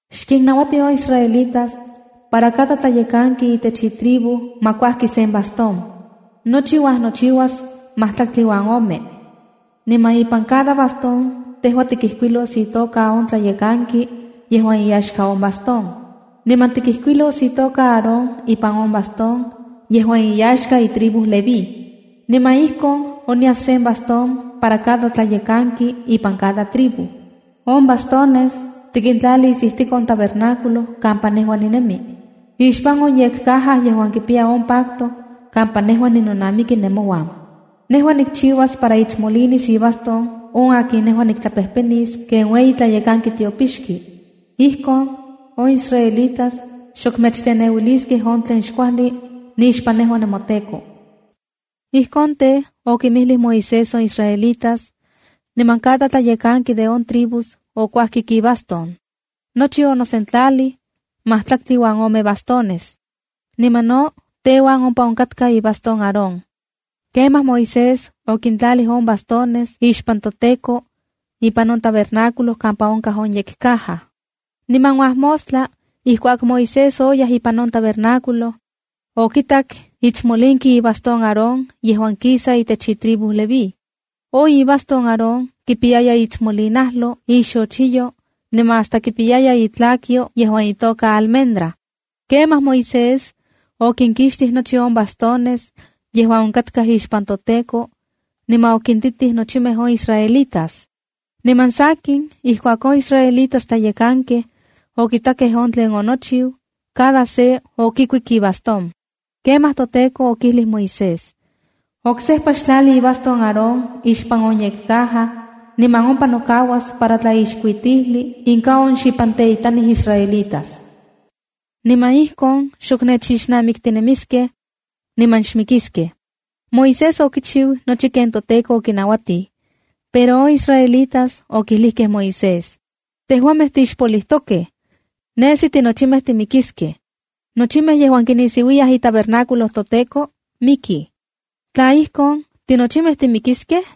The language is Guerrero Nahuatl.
“Xkinnauati on israelitas para cada tlayekanki itech cada tribu ma kuajki sen bastón. Nochi uajnochiuas majtlaktli uan ome. Niman ipan cada bastón tejua tikijkuilos itoka on tlayekanki yejuan iyaxka on bastón. Niman tikijkuilos itoka Aarón ipan on bastón yejuan iyaxka itribu Leví. Niman ijkon onyas sen bastón para cada tlayekanki ipan cada tribu. On bastones tikintlalis ijtik on tabernáculo kampa nejua ninemi, ixpan on yekcaja yejuan kipiya on pacto kampa nejua ninonamiki nemouan. Nejua nikchiuas para itsmolinis ibastón on akin nejua niktlapejpenis ken ueyi tlayekanki tiopixki. Ijkon on israelitas xok mechteneuiliskej on tlen xkuajli nixpan nejua nemoTEKO.” Ijki tej, okinmijlij Moisés on israelitas, niman cada tlayekanki de on tribus okuajkik ibastón. Nochi, onosentlajli majtlaktli uan ome bastones. Niman no teuan ompa onkakta ibastón Aarón. Kemaj Moisés okintlalij on bastones ixpan toTEKO ipan on tabernáculo kampa onkaj on yekcaja. Niman uajmostla ijkuak Moisés oyaj ipan on tabernáculo, okitak itsmolinki ibastón Aarón yejuan kisa itech itribu Leví. On ibastón Aarón kipiyaya iitsmolinajlo, ixochiyo, niman hasta kipiyaya itlakyo yejuan itoka almendra. Kemaj Moisés okinkixtij nochi on bastones yejuan onkatkaj ixpan toTEKO niman okintitij nochimej on israelitas. Niman sakin, ijkuak on israelitas tlayekankej okitakej on tlen onochiu, cada se okikuik ibastón. Kemaj toTEKO okijlij Moisés: “Oksejpa xtlali ibastón Aarón ixpan on yekcaja niman ompa nokauas para tlaixkuitijli inka on xipanteitanij israelitas. Niman ijkon xok nechixnamiktinemiskej niman xmikiskej.” Moisés okichiu nochi ken toTEKO okinauatij. Pero on israelitas okijlijkej Moisés: “¡Tejuamej tixpolijtokej! ¡Nesi tinochimej timikiskej! Nochimej yejuan kinisiuiyaj itabernáculo toTEKO, mikij. Tla ijkon, ¿tinochimej timikiskej?”